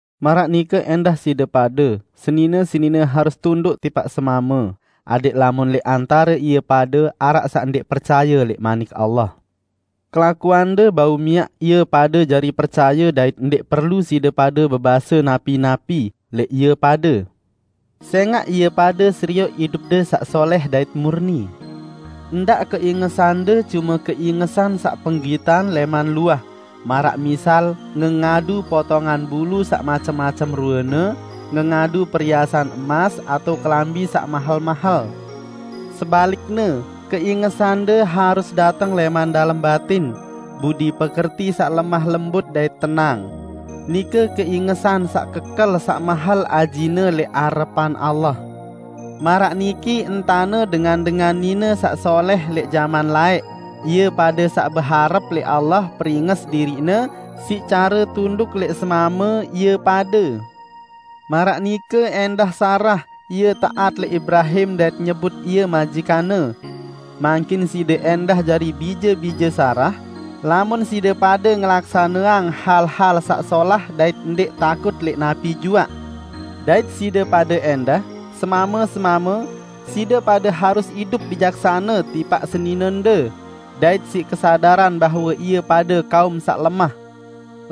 Maraq nike ẽndah side pade, senine-senine harus tunduk tipaq semame adẽq lamun lẽq antare ie pade araq saq ndẽq percaye lẽq Manik Allah, kelakuande bau miaq ie pade jari percaye dait ndẽq perlu side pade bebase napi-napi lẽq ie pade, sẽngaq ie pade serioq idupde saq solẽh dait murni. Ndaq keingesande cume keingesan saq penggitan lẽman luah, maraq misal ngengadu potongan bulu saq macem-macem ruene, ngengadu periasan emas, atao kelambi saq mahel-mahel. Sebalikne, keingesande harus dateng lẽman dalem batin, budi pekerti saq lemah lembut dait tenang; nike keingesan saq kekel saq mahel ajine lẽq arepan Allah. Maraq niki entane dengan-dengan nine saq solẽh lẽq jaman laẽq, ie pade saq beharep lẽq Allah peringes diriqne siq care tunduk lẽq semame ie pade. Maraq nike ẽndah Sarah, ie taat lẽq Ibrahim dait nyebut ie majikanne. Mangkin side ẽndah jari bije-bije Sarah, lamun side pade ngelaksaneang hal-hal saq solah dait ndẽq takut lẽq napi juaq. Dait side pade ẽndah, semame-semame, side pade harus idup bijaksane tipaq seninende, dait siq kesadaran bahwe ie pade kaum saq lemah.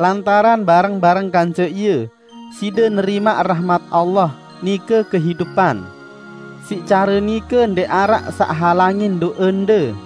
Lantaran bareng-bareng kance ie, side nerimaq rahmat Allah, nike kehidupan. Siq care nike ndẽq araq saq halangin do'ende.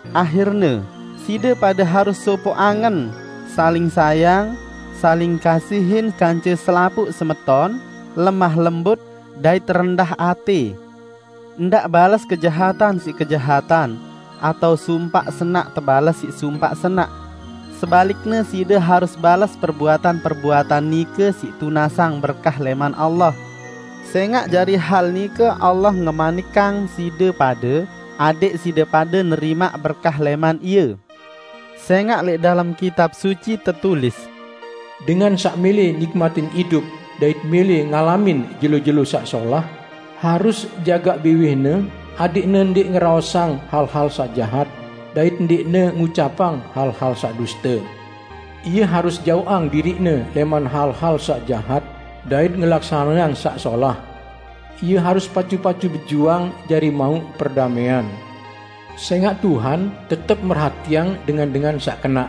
Ahirne, side pade harus sopoq angen, saling sayang, saling kasihin kance selapuq semeton, lemah lembut, dait rendah atẽ. Ndaq bales kejahatan siq kejahatan, atao sumpaq senaq tebales siq sumpaq senaq; sebalikne side harus bales perbuatan-perbuatan nike siq tunasang berkah lẽman Allah. Sẽngaq jari hal nike Allah ngemanikang side pade adẽq side pade nerimaq berkah lẽman Ie. Sẽngaq lẽq dalem Kitab Suci tetulis: "Dengan saq mẽlẽ nikmatin idup dait mẽlẽ ngalamin jelo-jelo saq solah, harus jagaq biwihne adẽqne ndẽq ngeraosang hal-hal saq jahat, dait ndẽqne ngucapang hal-hal saq duste. Ie harus jaoqang diriqne lẽman hal-hal saq jahat dait ngelaksaneang saq solah; ie harus pacu-pacu bejuang jari mauq perdamẽan. Sẽngaq Tuhan tetep merhatiang dengan-dengan saq kenaq,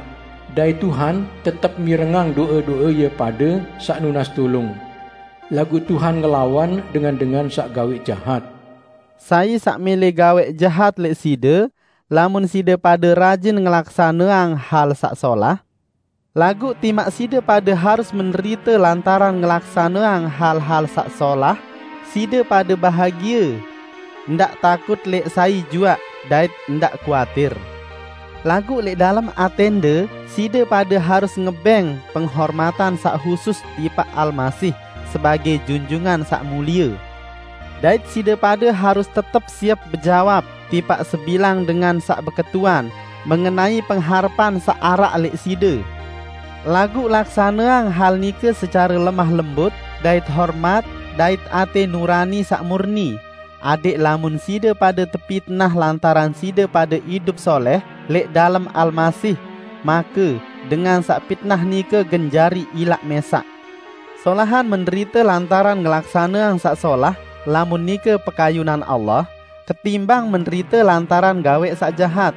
dait Tuhan tetep mirengang do'e-do'e ie pade saq nunas tulung; laguq Tuhan ngelawan dengan-dengan saq gawẽq jahat." Sai saq mẽlẽ gawẽq jahat lẽq side, lamun side pade rajin ngelaksaneang hal saq solah? Laguq timaq side pade harus menderite lantaran ngelaksaneang hal-hal saq solah, side pade bahagie! Ndaq takut lẽq sai juaq, dait ndaq kuatir. Laguq lẽq dalem atẽnde, side pade harus ngebẽng penghormatan saq husus tipaq Almasih sebagẽ Junjungan Saq Mulie. Dait side pade harus tetep siep bejawab tipaq sebilang dengan saq beketuan mengenai pengharepan saq araq lẽq side. Laguq laksaneang hal nike secare lemah lembut dait hormat dait atẽ nurani saq murni, adẽq lamun side pade tepitnah lantaran side pade idup solẽh lẽq dalem Almasih, make dengan saq pitnah nike gen jari ilaq mẽsaq. Solahan menderite lantaran ngelaksaneang saq solah -- lamun nike pekayunan Allah -- ketimbang menderite lantaran gawẽq saq jahat.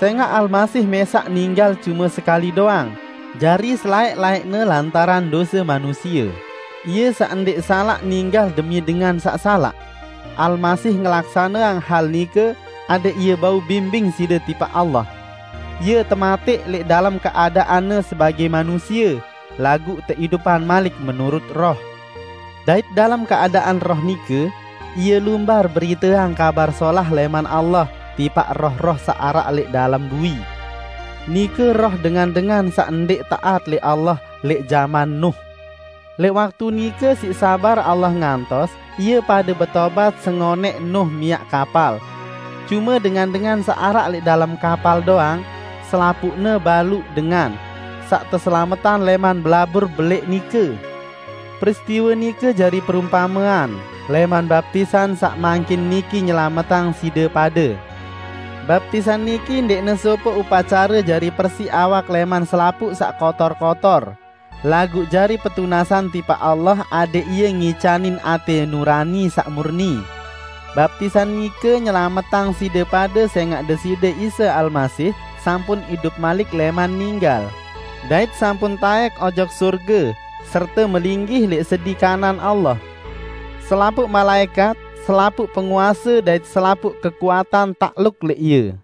Sẽngaq Almasih mẽsaq ninggal cume sekali doang, jari selaẽq-laẽqne lantaran dose manusie -- Ie saq ndẽq salaq, ninggal demi dengan saq salaq. Almasih ngelaksaneang hal nike adẽq Ie bau bimbing side tipaq Allah. Ie tematẽq lẽq dalem keadaan-Ne sebagẽ manusie, laguq teidupang malik menurut Roh. Dait dalem keadaan Roh nike, Ie lumbar beriteang Kabar Solah lẽman Allah tipaq roh-roh saq araq lẽq dalem bui: Nike roh dengan-dengan saq ndẽq taat lẽq Allah lẽq jaman Nuh. Lẽq waktu nike siq sabar Allah ngantos ie pade betobat sengonẽq Nuh miaq kapal. Cume dengan-dengan saq araq lẽq dalem kapal doang -- selapuqne baluq dengan -- saq teselametang lẽman belabur belẽq nike. Peristiwe nike jari perumpamean lẽman baptisan saq mangkin niki nyelametang side pade. Baptisan niki ndẽqne sopoq upacare jari persiq awak lẽman selapuq saq kotor-kotor, laguq jari petunasan tipaq Allah adẽq Ie ngicanin atẽ nurani saq murni. Baptisan nike nyelametang side pade sẽngaq Deside Isa Almasih sampun idup malik lẽman ninggal, dait sampun taẽk ojok sorge serte melinggih lẽq sedi kanan Allah. Selapuq malaẽkat, selapuq penguase dait selapuq kekuatan takluk lẽq Ie.